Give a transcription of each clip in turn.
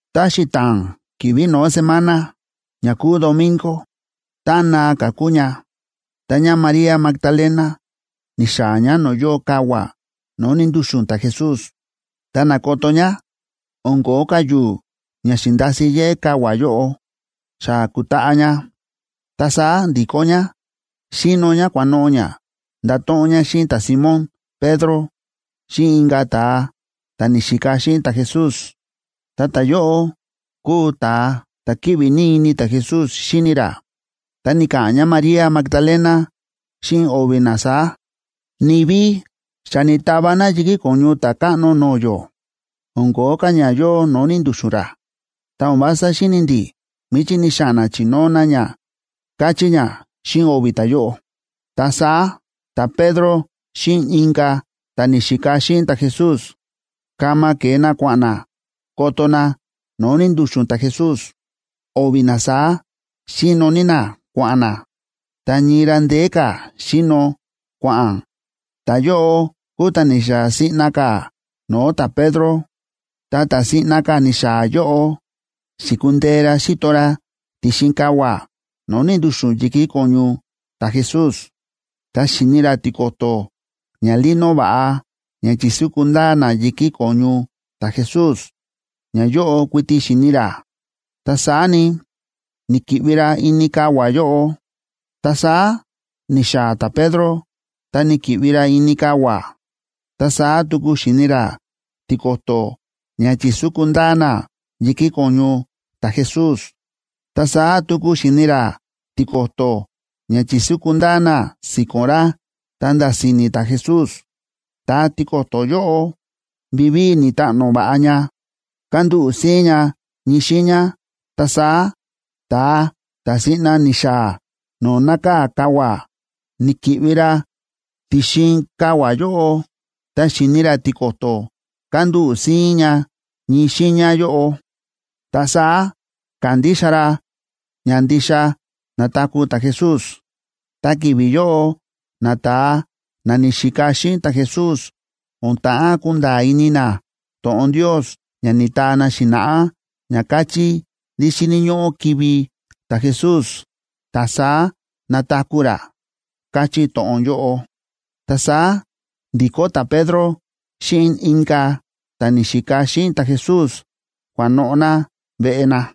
Ta xita̱a̱n ki̱vi̱ no̱ó semana, ña kúu domingo, táꞌan naa ka̱ kúu ña, ta ñáMaría Magdalena ni̱xaa̱ ñá no̱o̱ yóo kavua̱ no̱o̱ ni̱ndu̱xu̱n ta̱Jesús. Ta na̱koto ñá o̱n ko̱ó ka̱ yu̱u̱ ña xi̱ndasi yéꞌé kavua̱ yóꞌo, xa ku̱taꞌa ña. Ta saá ndi̱kó ñá, xíno ñá kua̱noꞌo̱ ñá ndato̱ꞌon ñá xíꞌin ta̱Simón Pedro xíꞌin inka̱ ta̱a ta̱ ni̱xika xíꞌin ta̱Jesús. Ta ta̱yóꞌo kúu ta̱a ta̱ kíꞌvi ní ini ta̱Jesús xíni ra. Ta ni̱ka̱ꞌa̱n ñáMaría Magdalena xíꞌin o̱vi̱ na saá: ―Ni̱vi xa ni̱tava na yi̱kí ko̱ñu Ta̱a Ta̱káꞌno no̱o̱ yó, o̱n ko̱ó ka̱ ña yóo no̱o̱ ni̱ndu̱xu̱n ra. Ta o̱n vása xíni̱ ndi̱ míchí ni̱xa̱ꞌa̱n na chi̱nóo na ña ―káchí ñá xíꞌin o̱vi̱ ta̱yóꞌo. Ta saá ta̱Pedro xíꞌin inka̱ ta̱ ni̱xika xíꞌin ta̱Jesús kama ke̱e na kua̱ꞌa̱n na koto na no̱o̱ ni̱ndu̱xu̱n ta̱Jesús. O̱vi̱ na saá xíno ní na kua̱ꞌa̱n na, ta ñii ra ndeé ka̱ xíno kua̱ꞌa̱n, ta ta̱yóꞌo kúu ta̱ ni̱xaa̱ siꞌna ka̱ no̱o̱ ta̱Pedro. Ta ta̱ siꞌna ka̱ ni̱xaa̱ yóꞌo, xi̱kundee ra xíto ra ti̱xin kavua̱ no̱o̱ ni̱ndu̱xu̱n yi̱kí ko̱ñu ta̱Jesús, ta xi̱ni ra tiko̱to̱ ñalino va̱ꞌa ña chi̱súku ndaa na yi̱kí ko̱ñu ta̱Jesús, ñayóꞌo kuiti xi̱ni ra, ta saá ni, ni̱‑kiꞌvi ra ini kavua̱ yóꞌo. Ta saá ni̱xaa̱ ta̱Pedro, ta ni̱ki̱ꞌvi ra ini kavua̱, ta saá tuku xi̱ni ra tiko̱to̱ ña chi̱súku ndaa na yi̱kí ko̱ñu ta̱Jesús. Ta saá tuku xi̱ni ra tiko̱to̱ ña chi̱súku ndaa na si̱ko̱n ra ta̱nda̱ si̱ni̱ ta̱Jesús. Ta tiko̱to̱ yóꞌo, vivíi ni̱taꞌno va̱ꞌa ña, kándúꞌu̱ síín ña ñii xiiña. Ta saá, ta̱a ta̱ siꞌna ni̱xaa̱ no̱o̱ nákaa̱ kavua̱, ni̱ki̱ꞌvi ra ti̱xin kavua̱ yóꞌo. Tá xi̱ni ra tiko̱to̱ kándúꞌu̱ síín ña ñii xiiña yóꞌo, ta saá ka̱ndixa ra ña ndixa na̱taku̱ ta̱Jesús. Ta ki̱vi̱ yóꞌo nata̱a na ni̱xika xíꞌin ta̱Jesús o̱n ta̱ꞌán kunda̱a̱ ini na to̱ꞌon Ndios ña ni̱taa na xi̱na̱ꞌá ña káchí ndí xíni̱ ñóꞌó kivi̱ ta̱Jesús, ta saá nataku̱ ra, káchí to̱ꞌon yóꞌo. Ta saá ndi̱kó ta̱Pedro xíꞌin inka̱ ta̱ ni̱xika xíꞌin ta̱Jesús, kua̱noꞌo̱ na veꞌe na.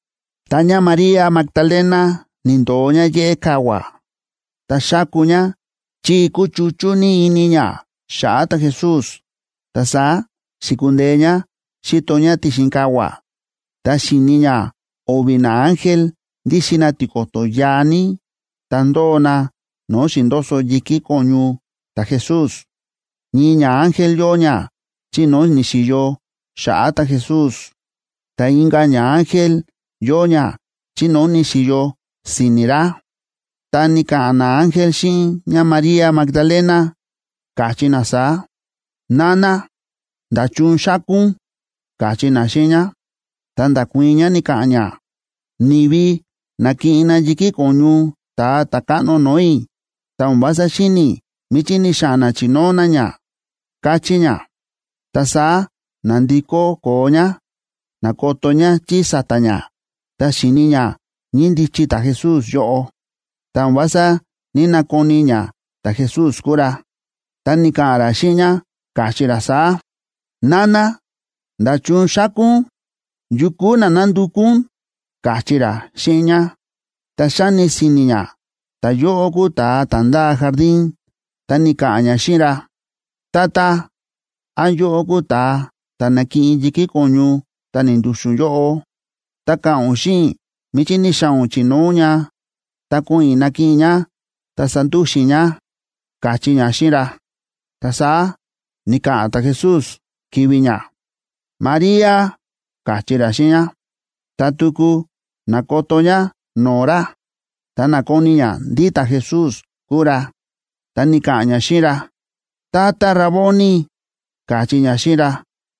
Ta ñáMaría Magdalena ni̱ndo̱o ñá yéꞌé kavua̱, ta xáku ñá chi kúchuchú ní ini ñá xa̱ꞌa̱ ta̱Jesús. Ta saá xi̱kundee ñá xi̱to ñá ti̱xin kavua̱, ta xi̱ni ñá o̱vi̱ naángel ndíxin na tiko̱to̱ yaa ní, ta ndóo na no̱o̱ xi̱ndoso yi̱kí ko̱ñu ta̱Jesús. Ñii ñaángel yóo ña chi no̱o̱ ni̱xi̱yo xa̱ꞌa̱ ta̱Jesús, ta inka̱ ñaángel yóo ña chi no̱o̱ ni̱xi̱yo si̱ni̱ ra. Ta ni̱ka̱ꞌa̱n naángel xíꞌin ñáMaría Magdalena, káchí na saá: ―Nana, ¿nda̱chun xáku ún? ―káchí na xíꞌin ñá. Ta nda̱kuii̱n ñá, ni̱ka̱ꞌa̱n ñá: ―Ni̱vi na̱kiꞌin na yi̱kí ko̱ñu Ta̱a Ta̱káꞌno no̱o̱ i̱, ta o̱n vása xíni̱ i̱ míchí ni̱xa̱ꞌa̱n na chi̱nóo na ña ―káchí ñá. Ta saá na̱ndikó koo ñá, na̱koto ñá chí sa̱ta̱ ñá, ta xi̱ni ñá ñíndichi ta̱Jesús yóꞌo, ta o̱n vása ní‑nakoni ñá ta̱Jesús kúu ra. Ta ni̱ka̱ꞌa̱n ra xíꞌin ñá, káchí ra saá: ―Nana, ¿nda̱chun xáku ún? ¿Yu kúu na nándukú ún? ―káchí ra xíꞌin ñá. Ta xáni si̱ni̱ ñá ta̱yóꞌo kúu ta̱a ta̱ ndáa jardín, ta ni̱ka̱ꞌa̱n ñá xíꞌin ra: ―Tata, ¿án yóꞌó kúu ta̱a ta̱ na̱kiꞌin yi̱kí ko̱ñu ta̱ ni̱ndu̱xu̱n yóꞌo?, ta ka̱ꞌa̱n ún xíꞌin i̱ míchí ni̱xa̱ꞌa̱n ún chi̱nóo ún ña, ta ko̱ꞌo̱n i̱ nakiꞌin i̱ ña ta sandúxu̱n i̱ ña ―káchí ñá xíꞌin ra. Ta saá ni̱ka̱ꞌa̱n ta̱Jesús ki̱vi̱ ñá: ―¡María! ―káchí ra xíꞌin ñá. Ta tuku na̱koto ñá no̱o̱ ra, ta na̱koni ñá ndí ta̱Jesús kúu ra, ta ni̱ka̱ꞌa̱n ñá xíꞌin ra: ―¡Tata Raboni! ―káchí ñá xíꞌin ra.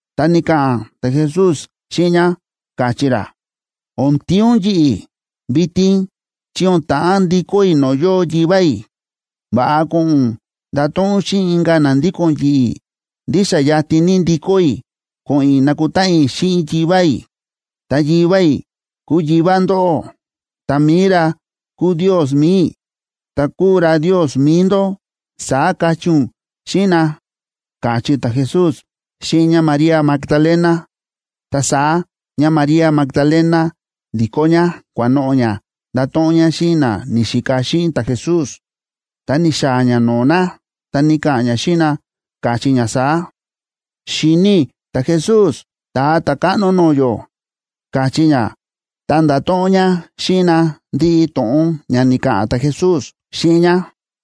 Ta ni̱ka̱ꞌa̱n ta̱Jesús xíꞌin ñá, káchí ra: ―O̱n tíin ún yi̱ꞌi̱ vitin, chi o̱n ta̱ꞌán ndikó i̱ no̱o̱ yóo Yivá i̱. Va̱ꞌa ko̱ꞌo̱n ún ndato̱ꞌon ún xíꞌin inka̱ na ndíko̱n yi̱ꞌi̱ ndí xa yatin ní ndikó i̱ ko̱ꞌo̱n i̱ nakutáꞌan i̱ xíꞌin Yivá i̱. Ta Yivá i̱ kúu Yivá ndóꞌó, ta mi̱i ra kúu Ndios mi̱i i̱, ta kúu ra Ndios mi̱i ndó, saá kachí ún xíꞌin na ―káchí ta̱Jesús xíꞌin ñáMaría Magdalena. Ta saá ñáMaría Magdalena ndi̱kó ñá kua̱noꞌo̱ ñá ndato̱ꞌon ñá xíꞌin na ni̱xika xíꞌin ta̱Jesús. Tá ni̱xaa̱ ñá no̱o̱ na, ta ni̱ka̱ꞌa̱n ñá xíꞌin na, káchí ñá saá: ―¡Xi̱ni i̱ ta̱Jesús Ta̱a Ta̱káꞌno no̱o̱ yó! ―káchí ñá, ta nda̱to̱ꞌon ñá xíꞌin na ndiꞌi to̱ꞌon ña ni̱ka̱ꞌa̱n ta̱Jesús xíꞌin ñá.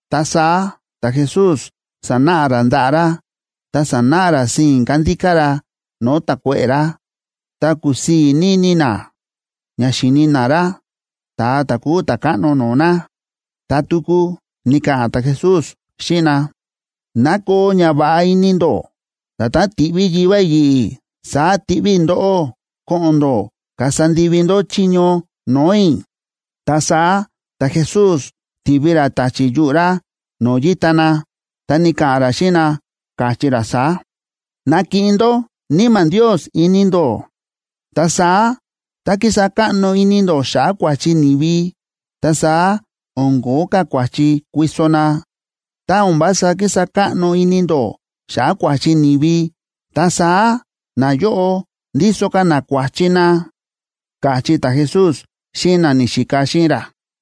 Ta saá ta̱Jesús sa̱náꞌa ra ndaꞌa̱ ra, ta sa̱náꞌa ra sii̱n kándíká ra no̱o̱ ta̱kuéꞌe̱ ra. Ta kúsii̱ ní ini na ña xíni na ra, ta̱a ta̱ kúu Ta̱káꞌno no̱o̱ na. Ta tuku ni̱ka̱ꞌa̱n ta̱Jesús xíꞌin na: ―¡Ná koo ñava̱ꞌa ini ndó! Nda̱tán ti̱ꞌví Yivá i̱ yi̱ꞌi̱, saá tiꞌví i̱ ndóꞌó ko̱ꞌo̱n ndó kasa ndivi ndó chiño no̱o̱ i̱. Ta saá ta̱Jesús ti̱vi ra ta̱chi̱ yuꞌu̱ ra no̱o̱ yíta na, ta ni̱ka̱ꞌa̱n ra xíꞌin na, káchí ra saá: ―Nakiꞌin ndó Níma̱ Ndios ini ndó. Ta saá tá kísa káꞌno ini ndó xa̱ꞌa̱ kua̱chi ni̱vi, ta saá o̱n kóo ka̱ kua̱chi kuiso na. Tá o̱n vása kísa káꞌno ini ndó xa̱ꞌa̱ kua̱chi ni̱vi, ta saá nayóꞌo ndíso ka̱ na kua̱chi na ―káchí ta̱Jesús xíꞌin na ni̱xika xíꞌin ra.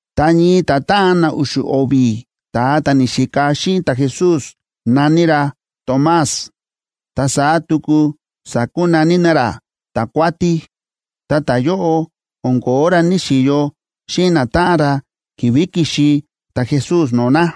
Ta ñii ta̱táꞌan na u̱xu̱ o̱vi̱ ta̱a na ni̱xika xíꞌin ta̱Jesús na̱ní ra Tomás, ta saá tuku sa̱kunaní na ra Ta̱kuátí, ta ta̱yóꞌo o̱n ko̱ó ra ní‑xiyo xíꞌin natáꞌan ra ki̱vi̱ ki̱xi ta̱Jesús no̱o̱ na.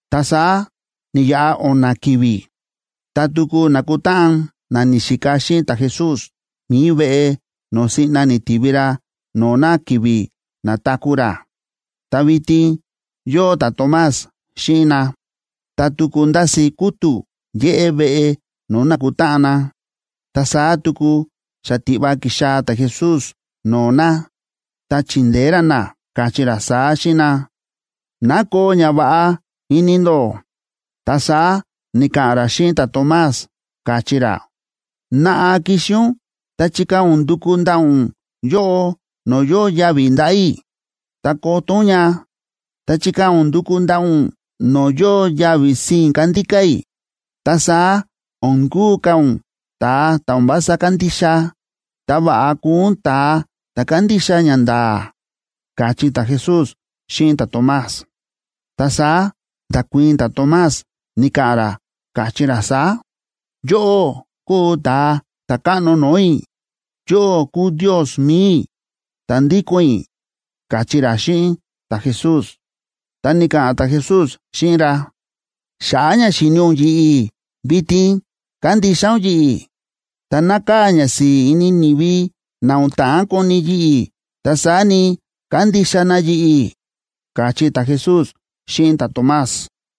Ta saá ni̱yaꞌa o̱na̱ ki̱vi̱, ta tuku na̱kutáꞌan na ni̱xika xíꞌin ta̱Jesús mi̱i veꞌe no̱o̱ siꞌna ni̱tivi ra no̱o̱ na ki̱vi̱ na̱taku̱ ra. Ta vitin yóo ta̱Tomás xíꞌin na. Ta tuku ndási kútu̱ yéꞌé veꞌe no̱o̱ na̱kutáꞌan na, ta saá tuku xatiꞌva ki̱xaa̱ ta̱Jesús no̱o̱ na, ta chi̱ndeé ra na, káchí ra saá xíꞌin ra: ―¡Ná koo ñava̱ꞌa ini ndó! Ta saá ni̱ka̱ꞌa̱n ra xíꞌin ta̱Tomás, káchí ra: ―Naꞌa kixi ún, ta chikaa̱ ún nduku ndaꞌa̱ ún yóꞌo, no̱o̱ yóo yavi̱ ndaꞌa̱ i̱, ta koto ún ña. Ta chikaa̱ ún nduku ndaꞌa̱ ún no̱o̱ yóo yavi̱ sii̱n kándíká i̱. Ta saá o̱n kúu ka̱ ún ta̱a ta̱ o̱n vása kándixa, ta va̱ꞌa kuu ún ta̱a ta̱ kándixa ñanda̱a̱ ―káchí ta̱Jesús xíꞌin ta̱Tomás. Ta saá nda̱kuii̱n ta̱Tomás, ni̱ka̱ꞌa̱n ra, káchí ra saá: ―¡Yóꞌó kúu Ta̱a Ta̱káꞌno no̱o̱ i̱! ¡Yóꞌó kúu Ndios mi̱i i̱, ta̱ ndíko̱n i̱! ―káchí ra xíꞌin ta̱Jesús. Ta ni̱ka̱ꞌa̱n ta̱Jesús xíꞌin ra: ―Xa̱ꞌa̱ ña xi̱ni ún yi̱ꞌi̱, vitin kándixa ún yi̱ꞌi̱. Ta nákaa̱ ñasi̱i̱ ini ni̱vi na o̱n ta̱ꞌán koni yi̱ꞌi̱, ta saá ni, kándixa na yi̱ꞌi̱ ―káchí ta̱Jesús xíꞌin ta̱Tomás.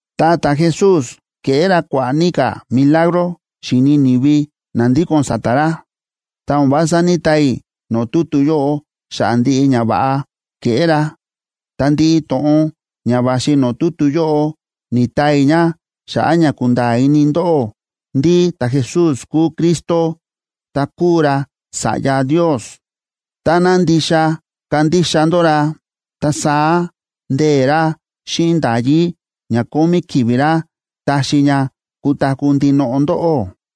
Ta ta̱Jesús ke̱ꞌé ra kua̱ꞌa̱ ní ka̱ milagro, xi̱ni ni̱vi na ndíko̱n sa̱ta̱ ra, ta o̱n vása ní‑taa i̱ no̱o̱ tutu yóꞌo xa̱ꞌa̱ ndiꞌi ñava̱ꞌa ke̱ꞌé ra. Ta ndiꞌi to̱ꞌon ña va̱xi no̱o̱ tutu yóꞌo, ni̱taa i̱ ña xa̱ꞌa̱ ña kunda̱a̱ ini ndóꞌó ndí ta̱Jesús kúu Cristo, ta kúu ra Sa̱ꞌya Ndios. Táná ndixa kandixa ndó ra, ta saá ndee̱ ra xíꞌin nda̱yí ña kómí ki̱vi̱ ra taxi ña kutaku̱ ndinoꞌo ndóꞌó.